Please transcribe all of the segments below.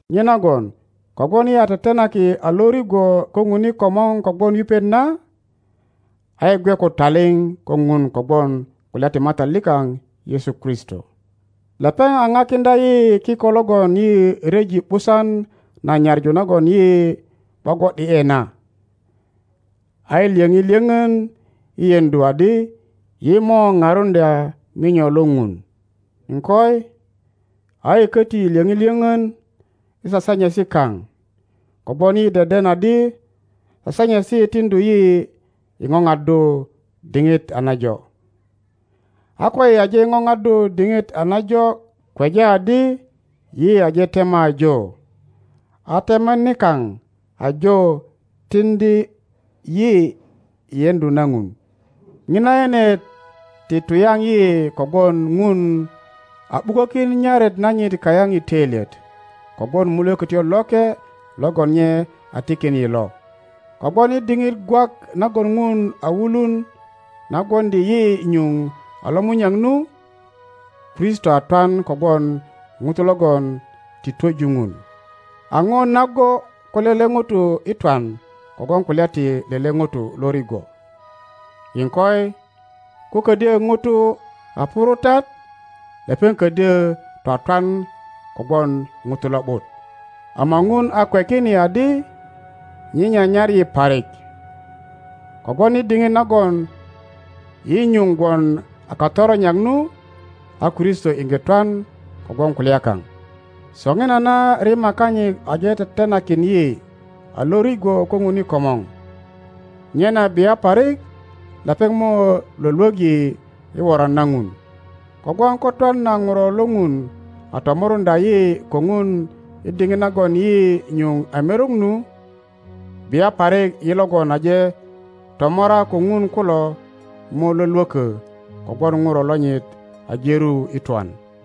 Nyenagon kogwon yi a tetenaki a lo rigwo ko Ŋun i komor kogwon yupet na, a yi gwe ko taliŋ ko Ŋun kogwon kulya ti Matat likaŋ Yesu Kristo. Lepeŋ a pakiŋdya yi kiko logon yi ryeji ’busan na nyaŋu nagon yi gwogwo ’di ’e na, a yi lyoŋi lyöŋön i yeŋdu adi yi mo parundya minyo lo Ŋun. iŋkoi, a yi köti lyöŋi lyoŋön i sasanyesi kaŋ, kogwon yi deden adi sasanyesi tiŋdu yi i ŋoŋaddu diŋit a najo, a koyi aje ŋoŋaddu diŋit a najo kweja adi yi aje tema ajo, a tema nikaŋ ajo tiŋdi yi i yeŋdu na Ŋun. Ŋina yenet ti tuyaŋ yi kogwon Ŋun a ’bukökin nyaret nanyit kayaŋ i töilyet kogwon Mulökötyo Loke logon nye a tikin yi lo. Kogwon i diŋit gwak nagon Ŋun a wulun na gwoŋdi yi nyuŋ a lomunyak nu, Kristo a twan kogwon ŋutu logon ti twöju Ŋun. A ŋo nago ko lele ŋuto i twan kogwon kulya ti lele ŋuto lo rigwo, iŋkoi, ko ködyö ŋuto a purutat, lepeŋ ködyö twatwan kogwon ŋuto lo ’but. Ama Ŋun a kwekin yi adi nye nyanyar yi parik, kogwon i diŋit nagon yi nyuŋ gwon a katoronyak nu, a Kristo iŋge twan kogwon kulya kaŋ. Soŋinana rima kanyit aje tetenakin yi a lo rigwo ko Ŋun i komor, nyena bia parik lepeŋ nio lwölwök yi i woran na Ŋun. Kogwon ko twan na Ŋuro lo Ŋun a tomoruŋdya yi ko Ŋun i diŋit nagon yi nyuŋ a merok nu, bia parik yi logon aje tomora ko Ŋun kulo mo lwölwökö kogwon Ŋuro lonyit aje ru i twan.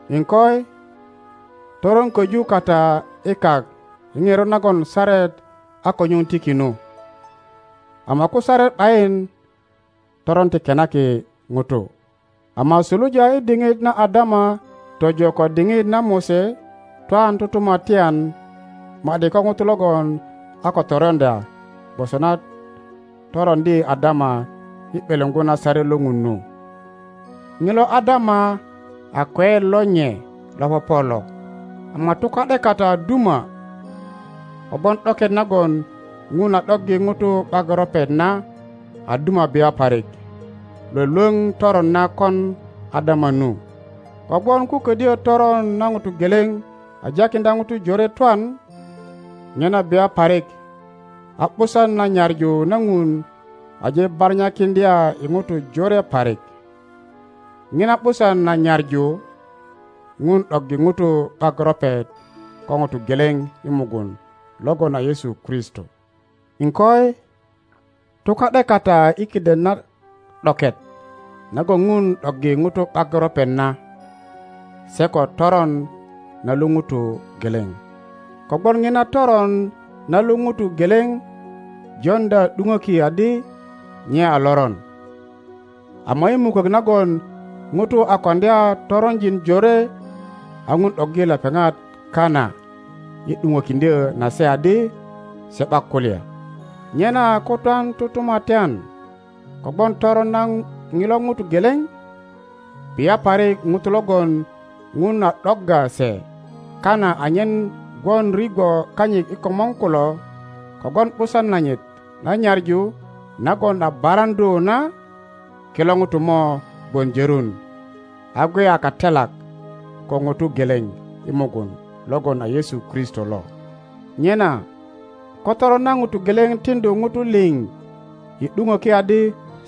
Iŋkoi, toron köju kata i kak i ŋerot nagon saret a ko nyuŋ tiki nu, ama ko saret ’bayin toron ti kenaki ŋutu. Ama suluja i diŋit na Adama tojo ko diŋit na Mose, twan tutumatyan ma ’di ko ŋuto logon a ko toroŋdya gwoso na toroŋdi Adama i ’beleŋo na saret lo Ŋun nu. Ŋilo Adama a kweyet lo nye lo popo lo. Ama tuka ’de kata a duma, kogwon ’doket nagon ŋun a ’doggi ŋutu ’bak ropet na a duma bia parik lwölwöŋ toron na kon Adama nu. Kogwon ko ködyö toron na ŋuto geleŋ a jakiŋdya ŋutu jore twan, nyena bia parik a ’busan na nyaŋu na Ŋun aje baranyakiŋdya i ŋutu jore parik. ŋina ’busan na nyaŋu, Ŋun ’doggi ŋutu ’bak ropet ko ŋuto geleŋ i mugun logon a Yesu Kristo. iŋkoi, tuka ’de kata i kiden na ’doket nagon ŋun ’doggi Ŋutu ’bak ropet na se ko toron na lu ŋuto geleŋ. Kogwon ŋina toron na lu ŋuto geleŋ joŋdya ’duŋöki adi nye a loron, ama i mukök nagon ŋutu a koŋdya toronjin jore a Ŋun ’doggi lepeŋat kana i ’duŋökiŋdyö na se adi se ’bak kulya. Nyena ko twan tutumatyan kogwon toron na ŋilo Ŋuto geleŋ, bia parik ŋutu logon Ŋun a ’dogga se kana anyen gwon rigwo kanyit i komor kulo kogwon ’busan nanyit na nyaŋu nagon a baraŋdu na, kilo ŋutu mo gwon jörun a gwe a katelak ko ŋuto geleŋ i mugun logon a Yesu Kristo lo. Nyena ko toron na ŋuto geleŋ tiŋdu ŋutu liŋ i ’duŋöki adi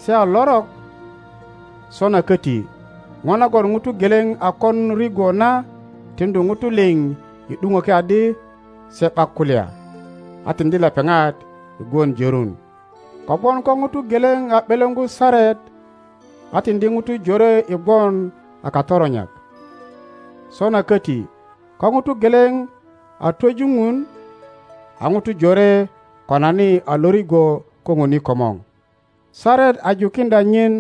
se a lorok, sona köti ŋo nagon ŋuto geleŋ n kon rigwo na tiŋdu Ŋutu liŋ i ’duŋoki adi se ’bak kulya, a tiŋdi lepeŋat i gwon jörun. Kogwon ko ŋuto geleŋ a ’beleŋo saret a tiŋdi ŋutu jore i gwon a katoronyak, sona köti ko ŋuto geleŋ a twöju Ŋun, a ŋutu jore konani a lo rigwo ko Ŋun i komor. Saret a jukiŋdya nyin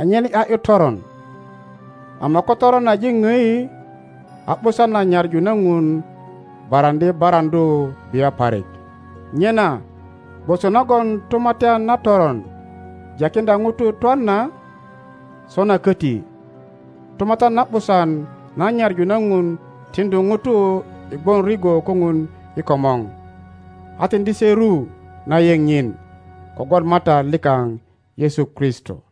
anyen ’ya ’yu toron, ama ko toron aje odi, a ’busan na nyaŋu na Ŋun baraŋdi baraŋdu bia parik. Nyena gwoso nagon tumatyan na toron jakiŋdya ŋutu twan na, sona köti tumatyan na ’busan na nyaŋu na Ŋun tiŋdu ŋutu i gwon rigwo ko Ŋun i komor, a tiŋdi se ru na yeŋ nyin kogwon Matat likaŋ Yesu Kristo.